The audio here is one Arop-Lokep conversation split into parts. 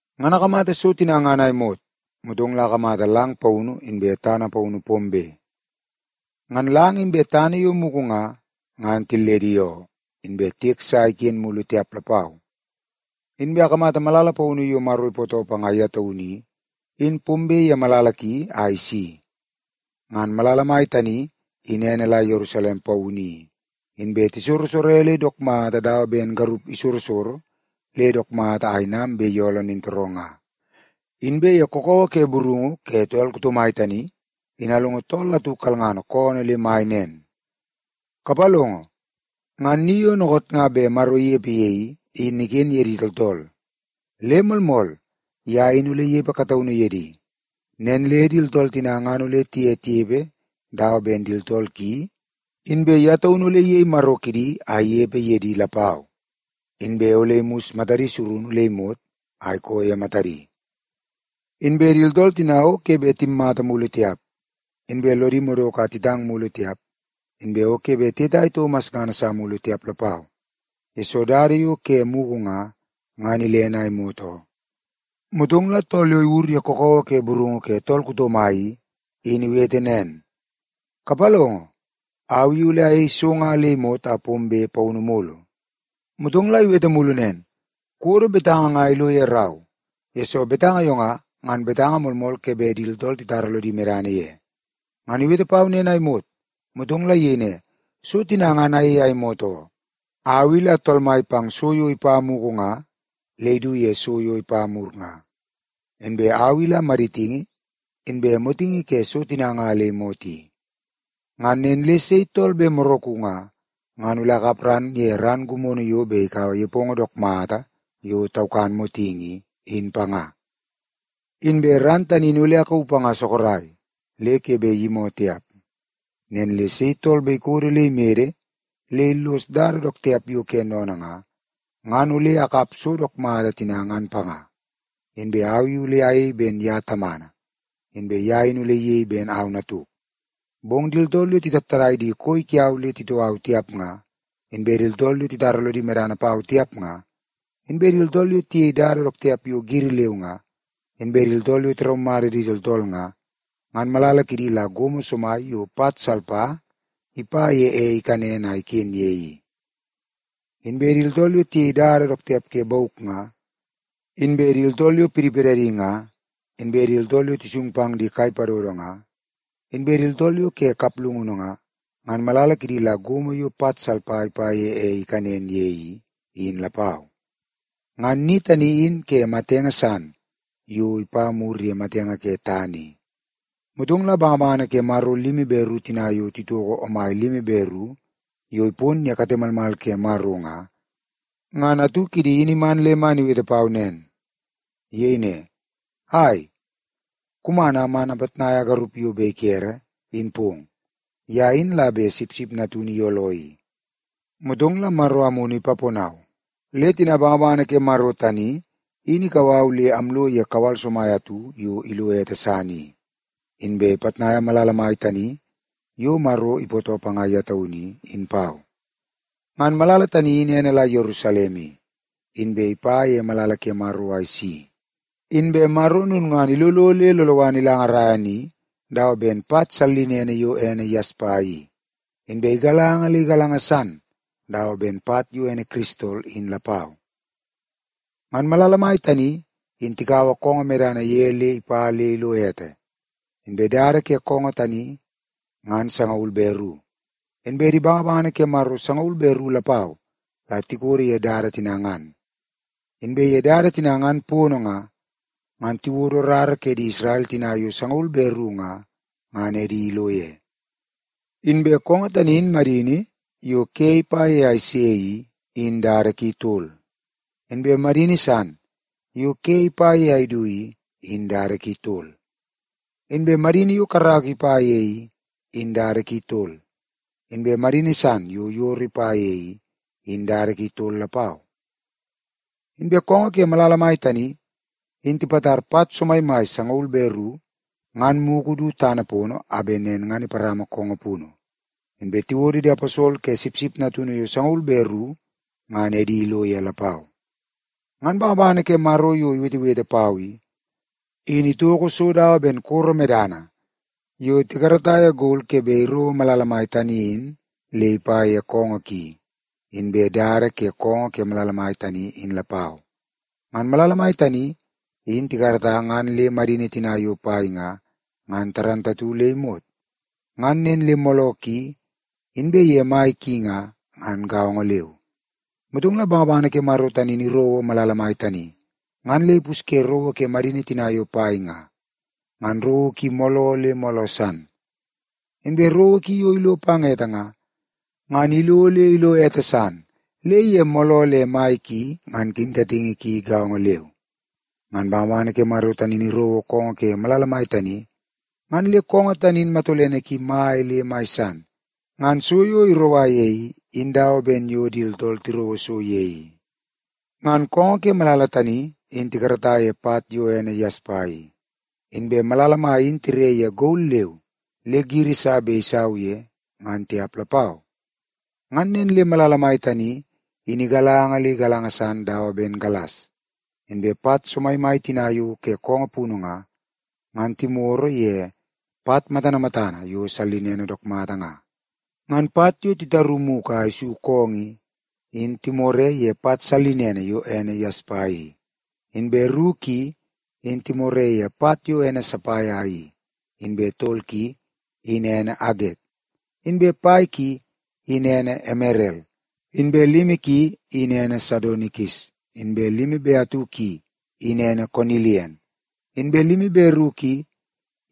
Ngan akamata so tina ngan a imot, motong la akamata lang paunu inbe tana paunu pombe. Ngan lang inbe tana yo mugu nga, ngan tilledi oo, inbe tiek sa iken mulu tiap lapau. Inbe akamata malala paunu yo Maro ipootoo panga ye taunu i, in pombe ye malala ki a isi. Ngan malala mai tani in ene la Yerusalem Paunu i, inbe tisorosore le dook mata dawa ben garup isorosoro le dook mata a inam bet iyooloo nintooroo nga. Inbe ye kakawa ke burungu ke tool kuto mai tani, in alongo tool atu kalngana koonoo le mai nen, “Kapalongo, ngan ni yo dookoot nga bet Maro inepe ye i, in iken ye di tooltool. Le moolmool, ye in ole inepe kataunu ye di. Nen le di tooltool tina ngan ole tiye tinepe dawa ben di tooltool ki, inbe ye taunu ole iyei Maro kidi a inepe ye di lapau. Inbe ole imus matadi surunu le imot a ikoo ye matadi. Inbe di tooltool tina o ke bet timmata mulu tiap, inbe lodi madoko a titang mulu tiap, inbe o ke bet tiyetai toko masngana sa mulu tiap lapau, yesoo dada yo ke mugu nga, ngan ilene a imot oo.” Motong la tool yo iwur ye kakawa ke burungu ke tool kuto mai i, in iwete nen, “Kapalongo, au i ole ayei so nga le imot a pombe paunu mulu!” Motong la iwete mulu nen, “Kuwodo betanga nga ilo ye rau, yesoo betanga yo nga, ngan betanga moolmool ke bet di tooltool titara lodi medana ye.” Ngan iwete pau nen a imot, motong la iyei ne, “So tina ngan ayei a imot oo. Au i la Tool Mai pang so yo ipa mugu nga le idu ye so yo ipa mur nga. Inbe au i la maditingi, inbe motingi ke so tina nga le imot i. Ngan nen le sei tool bet moraku nga, ngan ole akap ran ye ran gimono yo bet ikaua nepongo dook mata yo taukan motingi i, in panga. Inbe ran tani in ole akauu panga sorok, le ke bet iyimoo tiap. Nen le sei tool bet ikodo le imede le illos dada dook tiap yo ke sennene nga, ngan ole akap so dook mata tina ngan panga. Inbe au i ole ayei ben ye Tamana, inbe ye in ole iyei ben au Natuk. Bong di tooltool yo titattadai di koi kiau le titoo au tiap nga, inbe di tooltool yo titara lodi medana pau tiap nga, inbe di tooltool yo tiyei dada dook tiap yo giri leu nga, inbe di tooltool yo tiraumata di tooltool nga, ngan malala kidi la gomo somai yo pat salpa ipa ye ei ikanen a iken ye i. Inbe di tooltool yo tiyei dada dook tiap ke bauk nga, inbe di tooltool yo pidipidadi nga, inbe di tooltool yo tisung pang di kai padodo nga, inbe di tooltool yo ke kaplungunu nga, ngan malala kidi la gomo yo pat salpa ipa ye ei ikanen ye i, in lapau. Ngan ni tani in ke matenge san yo ipa mur ye matenge ke tana i.” Motong la di bangabangana ke Maro limi be ru tina yo titoko omai limi be ru yo ipon ye kate malmal ke Maro nga, ngan atu kidi in iman le man iwete pau nen. Iyei ne, “Ai, kuman a man apitnaia garup yo bet ikere, in pong. Ye in la bet Sipsip Natunu iyooloo i.” Motong la Maro Amunu ipaponau le tina bangabangana ke Maro tani in ikau au le amlo ye kawal somai atu yo ilo ete san i, inbe ipitnaia malala mai tani yo Maro ipootoo panga ye taunu i, in pau. Ngan malala tani in ene la Yerusalem i, inbe ipa ye malala ke Maro a isi. Inbe Maro lulngana ilolo le loloana ilangarai ni dawa ben pat sallinene yo ene yaspa i, inbe igalanga le igalanga san dawa ben pat yo ene kiristol in lapau. Ngan malala mai tani in tikaua koongoo medana ye le ipa le ilo ete. Inbe dada ke koongoo tani ngan sangaul be ru, inbe di bangabangana ke Maro sangaul be ru lapau la tikodo ye dada tina ngan. Inbe ye dada tina ngan pono nga, ngan tiwodo rara ke di Isrel tina yo sangaul be ru nga, ngan edi ilo ye. Inbe koongoo tani in madini yo ke ipa ye a ise i, in dada ki tol. Inbe madini san yo ke ipa ye a idu i, in dada ki tol. Inbe madini yo karaka ipa ye i, in dada ki tol. Inbe madini san yo yoro ipa ye i, in dada ki tol lapau. Inbe koongoo ke malala mai tani, in tipatar pat somaimai sangaul be ru ngan mugu du tana pono a bet nen ngan iparama koongoo punu. Inbe tiwodo di aposol ke Sipsip Natunu yo sangaul be ru ngan edi ilo ye lapau. Ngan bangabangana ke Maro yo iwetewete pau i, in itoko so dawa ben koro medana yo tikarata ye gol ke bet irouo malala mai tani in le ipa ye koongoo ki, inbe dada ke koongoo ke malala tani in lapau. Ngan malala mai tani in tikarata ngan le madini tina yo pai nga, ngan gaongo le imot. Ngan nen le mooloo ki inbe ye mai ki nga, ngan gaongo leu. Motong la bangabangana ke Maro tani in irouo malala mai tani, ngan le ipusye rowo ke madini tina yo pai nga, ngan rowo ki mooloo le mooloo san. Inbe rowo ki yo ilo pang ete nga, ngan ilo le ilo ete san le ye mooloo le mai ki ngan kinkatingi ki gaongo leu. Ngan bangabangana ke Maro tani in irouo koongoo ke malala mai tani, ngan le koongoo tani in matolene ki mai le mai san. Ngan so yo iroua ye i, in dawa ben yo di tooltool tirouo so ye i. Ngan koongoo ke malala tani in tikarata ye pat yo ene yaspa i. Inbe malala mai in tire ye gol leu le giri sa bet isau ye, ngan tiap lapau. Ngan nen le malala mai tani in igalanga le igalanga san dawa ben galas. Inbe pat somaimai tina yo ke koongoo punu nga, ngan timoro ye pat matana matana yo sallinene dook mata nga. Ngan pat yo titaru mugu a isu koongoo i, in timore ye pat sallinene yo ene yaspa i; inbe ru ki, in timore ye pat yo ene sapaia i; inbe tol ki, in ene aget; inbe pai ki, in ene emerel; inbe limi ki, in ene sadonikis; inbe limi be atu ki, in ene konilian; inbe limi be ru ki,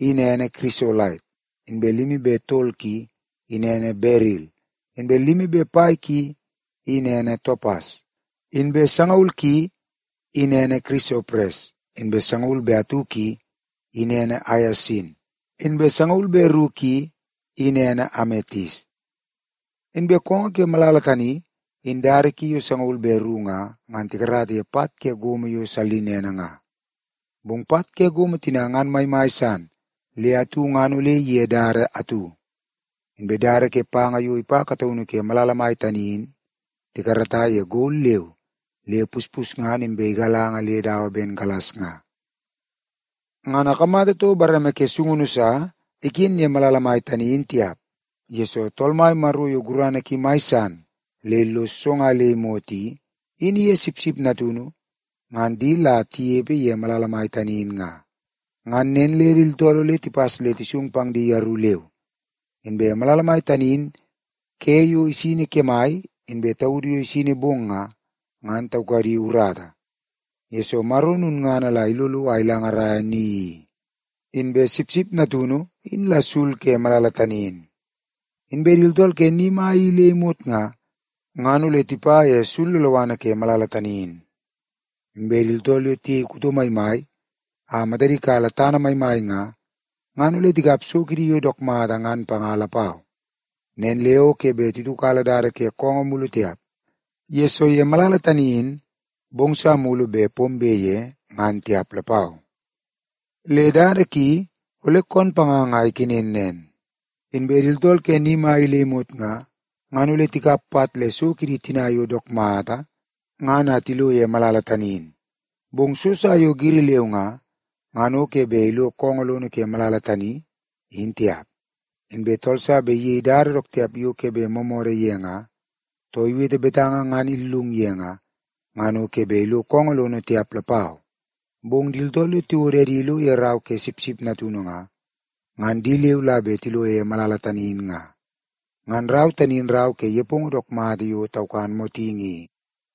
in ene kirisolait; inbe limi be tol ki i, in ene beril; inbe limi be pai ki, in ene topas; inbe sangaul ki, in ene kirisopres; inbe sangaul be atu ki, in ene aiasin; inbe sangaul be ru ki, in ene ametis. Inbe koongoo ke malala tani in dada ki yo sangaul be ru nga, ngan tikarata ye pat ke gomo yo sallinene nga. Bong pat ke gomo tina ngan maimai san le atu ngan ole ige dada atu. Inbe dada ke panga yo ipa kataunu ke malala mai tani in tikarata ye gol leu le puspusngana inbe igalanga le dawa ben galas nga. Ngan akamata toko bareme ke sungunu sa iken ye malala mai tani in tiap, yesoo Tool Mai Maro yo gurana ki mai san le illos so nga le imot i, in iye Sipsip Natunu ngan di la tinepe ye malala mai tani in nga. Ngan nen le di tooltool ole tipas le tisung pang di yeru leu. Inbe malala mai tani in ke yo isini kemai inbe taudu yo isini bong nga, ngan taukadi urata, yesoo Maro lulngana la ilolo a ilangaraia ni i, inbe Sipsip Natunu in la sul ke malala tani in. Inbe di tooltool ke ni mai i le imot nga, ngan ole tipa ye sul loloana ke malala tani in. Inbe di tooltool yo tiyei kuto maimai a matadi kala tana maimai nga, ngan ole tikap so kidi yo dook mata ngan panga lapau. Nen le o ke bet titiukala dada ke koongoo mulu tiap, yesoo ye malala tani in bong sa mulu bet pombe ye ngan tiap lapau. Le dada ki ole koon panganga a ikenen nen. Inbe di tooltool ke ni mai i le imot nga, ngan ole tikap pat le so kidi tina yo dook mata ngan a tilo ye malala tani in. Bong so sa yo giri leu nga, ngan ke bet ilo koongoo lono ke malala tani, in tiap. Inbe tool sa bet iyei dada dook tiap yo ke bet moomoodoo ye nga, too iwete betanga ngan illung ye nga, ngan o ke bet ilo koongoo lono tiap lapau. Bong di tooltool yo tiwodo edi ilo ye rau ke Sipsip Natunu nga, ngan di leu la bet tilo ye malala tani in nga. Ngan rau tani in rau ke nepongo dook mata yo taukan motingi i.